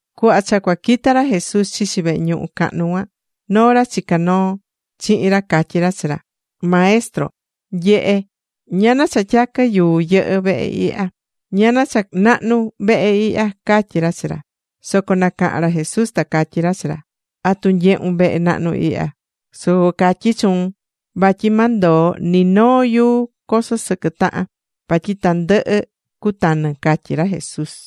Cuhva cha cua quita ra Jesús chichi vehe ñuhu cahnu cuan, noo ra chicá noo chihin ra catyi ra chi ra: ―¡Maestro, nye̱he ñana cha tyaquɨ yuu yɨhɨ́ vehe ihya! ¡Ñana cha nahnu vehe ihya! ―catyí ra chi ra Jesús. Soco nacaha̱n ra Jesús, ta catyí ra chi ra: ―¿Atu nyehún vehe nahnu ihya? Soco catyí chuun vatyi ma ndoo ni noo yuu coso sɨquɨ tahan, vatyi tandɨhɨ cutanɨ ―catyí ra Jesús.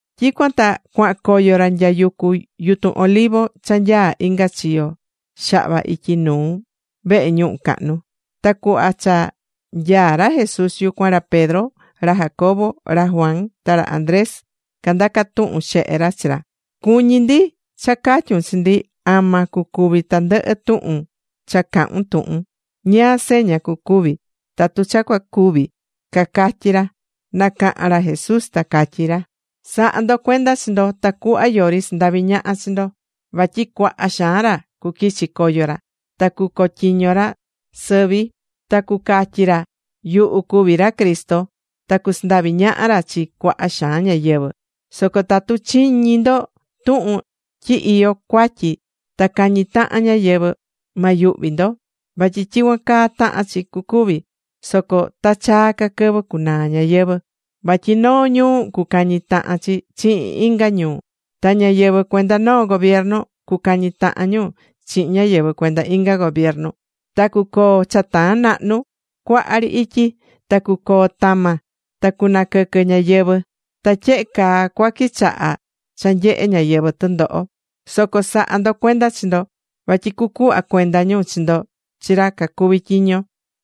Tyicuan ta cuahan coyo ra nya yucu yutun Olivo cha nyaá inga chiyo xahva ityi nuu vehe ñuhu cahnu. Ta cuhva cha nyaá ra Jesús yucuan, ra Pedro, ra Jacobo, ra Juan, ta ra Andrés candaca tuhun xehe ra chi ra: ―Cuñí ndi cha ca̱tyun chi ndi ama cucuvi tandɨhɨ tuhun cha cahu̱n tuhun. ¿Ñáá seña cucuvi tatu cha cua cuvi? ―cacatyí ra. Nacaha̱n ra Jesús ta catyí ra: ―Sa̱ha ndo cuenda chi ndo tacuhva yori sandavi ñaha chi ndo. Vatyi cuaha xaan ra cuquichi coyo ra, ta cucotyiño ra sɨvi ta cucatyi ra: “Yuhu cuví ra Cristo.” Ta cusandavi ñaha ra chi cuaha xaan ñáyɨvɨ. ’Soco tatu chiñí ndo tuhun tyi iyó cuatyi ta cañí tahan ñáyɨvɨ, ma nayuhvi ndo. Vatyi tyicuan caa tahán chi cucuvi, soco ta chaa ca quɨvɨ cunaa ñayɨvɨ̱. Vatyi noo ñuu cucañi tahan chi chihin inga ñuu, ta ñáyɨvɨ cuenda noo gobiernu cucañi tahan ñu chihin ñáyɨvɨ cuenda inga gobiernu. Ta cucoo cha taan nahnu cuaha ri ityi. Ta cucoo tama. Ta cunaquɨquɨ ñáyɨvɨ. Ta tyehe caa cua quichaha cha nyehe ñáyɨvɨ tɨndoho. Soco sa̱ha ndo cuenda chi ndo. Vatyi cucuhva cuenda ñu chi ndo chi ra cacuví tyiño.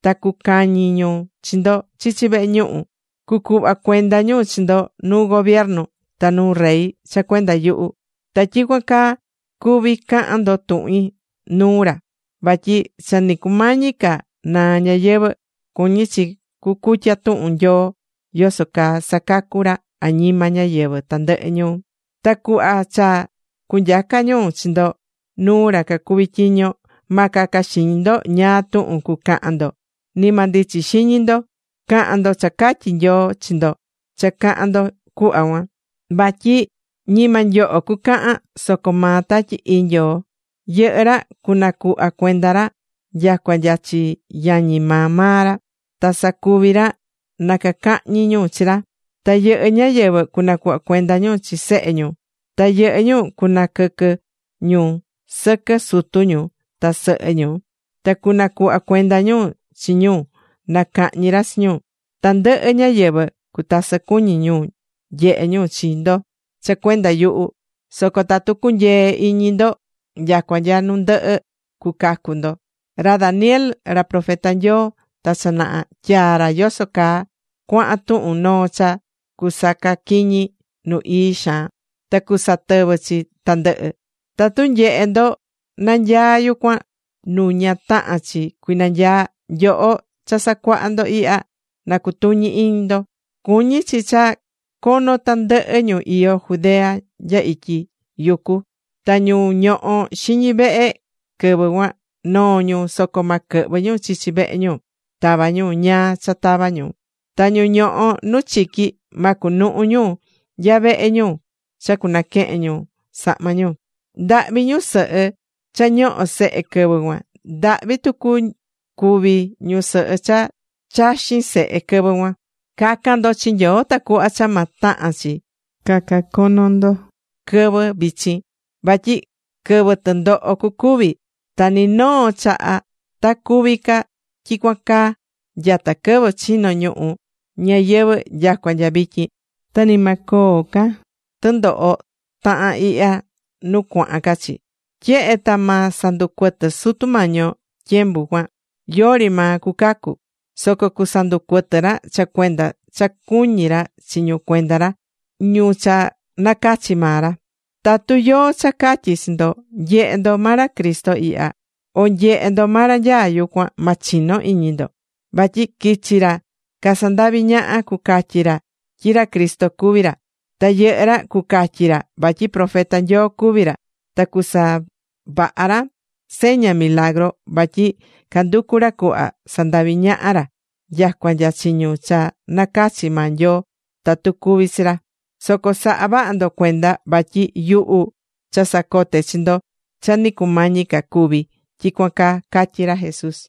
Ta cucañi ñu chi ndo chichi vehe ñuhu. Cucuhva cuenda ñu chi ndo nuu gobernador ta nuu rey cha cuenda yuhu. Ta tyicuan caa cuví cahan ndo tuhin nuu ra. Vatyi cha ni cumañi ca naa ñayɨvɨ̱, cuñí chi cucutya tuhun Nyoo yoso caa sacacú ra añima ñáyɨvɨ tandɨhɨ ñuu. Ta cuhva cha cunyaca ñu chi ndo nuu ra cacuví tyiño, ma caca xiñi ndo ñáá tuhun cucahan ndo, ni ma ndichi xiñi ndo. Ca̱han ndo cha catyi Nyoo chi ndo cha cahan ndo cuhva cuan. Vatyi ñima nyoho cucahan, soco maa Tatyi Ii Nyoo. Yɨhɨ́ ra cunacuhva cuenda ra nyacua nya chi yañi maa maa ra. Ta sacuvi ra na cacahñi ñu chi ra. Ta yɨhɨ́ ñáyɨvɨ cunacuhva cuenda ñu chi sehe ñu. Ta yɨhɨ́ ñu cunaquɨquɨ ñu sɨquɨ sutu ñu ta sɨhɨ ñu. Ta cunacuhva cuenda ñu chi ñu na cahñi ra chi ñu. Tandɨhɨ ñáyɨvɨ cutasɨ cuñi nyehe ñu chi ndo cha cuenda yuhu. Soco tatu cunyee iñi ndo nyacua nya nu ndɨhɨ, cucacu ndo. ’Ra Daniel, ra profeta Nyoo ta cha naha, tyaa̱ ra yoso caa cuahan tuhun noo cha cusacaquiñi nu ii xaan. Ta cusatɨvɨ chi tandɨhɨ. Tatu nyehé ndo nanyaá yucuan nu ña tahán chi cuinanyaa, (nyoho cha sacuahá ndo ihya na cutuñi iñi ndo) cuñí chi cha cono tandɨhɨ ñu iyó Judea nya ityi yucu. Ta ñu ñohó xiñi vehe quɨvɨ cuan, noo ñu, soco ma quɨhvɨ ñu chichi vehe ñu tava ñu ñáá cha tava ñu. Ta ñu ñohó nu chiqui, ma cunuhu ñu nya vehe ñu cha cunaquehen ñu sahma ñu. ¡Ndahvi ñusɨhɨ cha cañohó sehe quɨvɨ cuan! ¡Ndahvi tucu cuvi ñusɨhɨ cha chaxín sehe quɨvɨ cuan! Ca̱can ndo chi Nyoo tacuhva cha ma tahan chi caca cono ndo quɨvɨ vichin. Vatyi quɨvɨ tɨndoho cucuvi. Ta ni noo chaha ta cuvi ca tyicuan caa nyata quɨvɨ chino̱ ñuhu ñayɨvɨ̱ nyacua nya vityin. Ta ni ma coo ca tɨndoho tahán ihya nu cuahan ca chi. Tyehe ta ma sanducuɨtɨ Sutu Mañi yo tyembu cuan, yori maa cucacu. Soco cusanducuɨtɨ ra cha cuenda cha cuñí ra chi ñu cuenda ra, ñu cha nacachi̱ maa ra. ’Tatu yóó cha catyí chi ndo: “Nye̱he ndo, ma ra Cristo ihya” o “Nye̱he, ma ra nyaá yucuan”, ma chino iñi ndo. Vatyi cuquichi ra casandaví ñaha, cucatyi ra tyi ra Cristo cuví ra. Ta yɨhɨ́ ra cucatyi ra vatyi profeta Nyoo cacuví ra. Ta cucasavaha ra seña, milagru, vatyi canducú ra cuhva sandavi ñaha ra nyacua nya chi ñu cha nacachi̱ maa Nyoo tatu cuví chi ra. Soco sa̱ha vaha ndo cuenda vatyi yuhu cha sacote̱ chi ndo cha ni cumañi ca cuvi tyicuan caa ―catyí ra Jesús.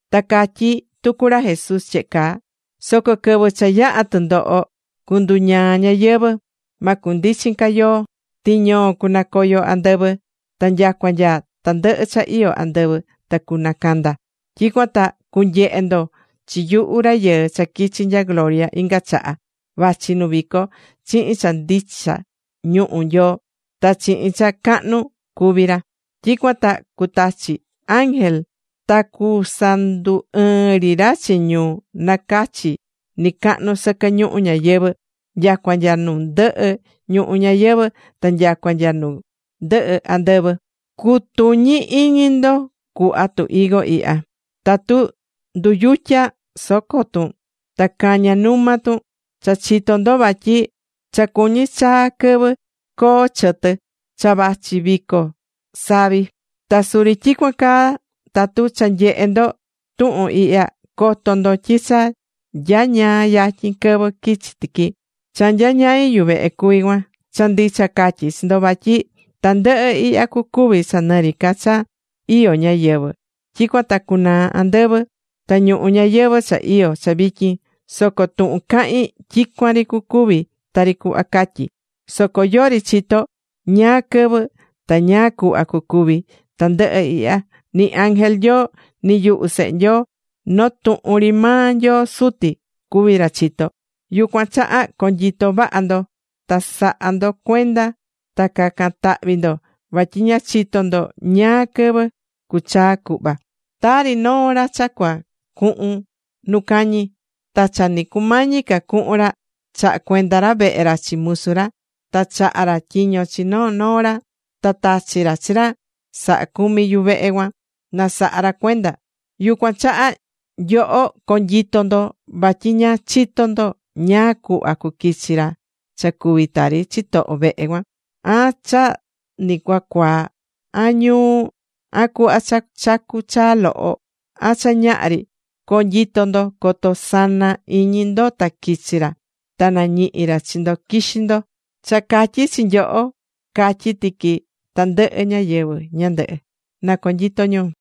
Ta catyí tucu ra Jesús tyehe caa: ―Soco quɨvɨ cha yaha tɨndoho, cunduñaa ñanyii. Ma cundichin ca yoo. Tiñoo cunacoyo andɨvɨ. Ta nyacua nya tandɨhɨ cha iyó andɨvɨ ta cunacanda. Tyicuan ta cunyehe ndo chi yuhu Rayɨɨ cha quichi̱ nya gloria inga chaha, vachi nu vico chihin cha ndicha ñuhu Nyoo, ta chihin cha cahnu cuví ra. Tyicuan ta cutachi chi ángel ta cusandu ɨɨn ri chi ñu nacachi̱ nɨcahnu sɨquɨ ñuhu ñayɨvɨ̱, nyacua nya nu ndɨhɨ ñuhu ñayɨvɨ̱ ta nyacua nya nu ndɨhɨ andɨvɨ. ’Cu̱tuñi iñi ndo cuhva tu higo ihya: Tatu nduyutya soco tun ta caña numa tun cha chitó ndo vatyi cha cuñí chaa quɨvɨ coo chɨtɨ, cha vachi vico savi. Ta suri tyicuan caa tatu cha nyehe ndo tuhun ihya, co̱to ndo tyi cha nyañaa yatyin quɨvɨ quichi tiqui. Cha nyañai yuvehe cuví cuan. Cha ndicha catyí chi ndo vatyi tandɨhɨ ihya cucuvi cha nɨ ri ca cha iyó ñáyɨvɨ. Tyicuan ta cunaa andɨvɨ ta ñuhu ñayɨvɨ̱ cha iyó cha vityin. Soco tuhun cahín tyicuan ri cucuvi tari cuhva catyí. ’Soco yori chitó ñáá quɨvɨ ta ñáá cuhva cucuvi tandɨhɨ ihya, ni ángel Nyoo, ni yuhu Sehe Nyoo. Noo tuhun ri maa Nyoo Suti cuví ra chitó. ’Yucuan chaha co̱nyito vaha ndo, ta sa̱ha ndo cuenda ta ca̱can tahvi ndo, vatyi ña chitó ndo ñáá quɨvɨ cuchaa cuhva. Tari noo ra cha cua cuhun nu cañi. Ta cha ni cumañi ca cuhun ra, chaha̱ cuenda ra vehe ra chi musu ra. Ta chaha̱ ra tyiño chi noo noo ra. Ta tachi̱ ra chi ra sahá cumi yuvehe cuan na saha ra cuenda. Yucuan chaha nyoho co̱nyito ndo vatyi ña chitó ndo ñáá cuhva cuquichi ra cha cuví tari chitoho vehe cuan, an cha ni cua cuaa, an ñuu, an cuhva cha chacú chaa loho, an cha ñaha ri. Co̱nyito ndo coto sana iñi ndo ta quichi ra, ta nañihi ra chi ndo quixí ndo. Cha catyi̱ chi nyoho, catyí tiqui chi tandɨhɨ ñáyɨvɨ ñandɨhɨ. Na conyito ñu.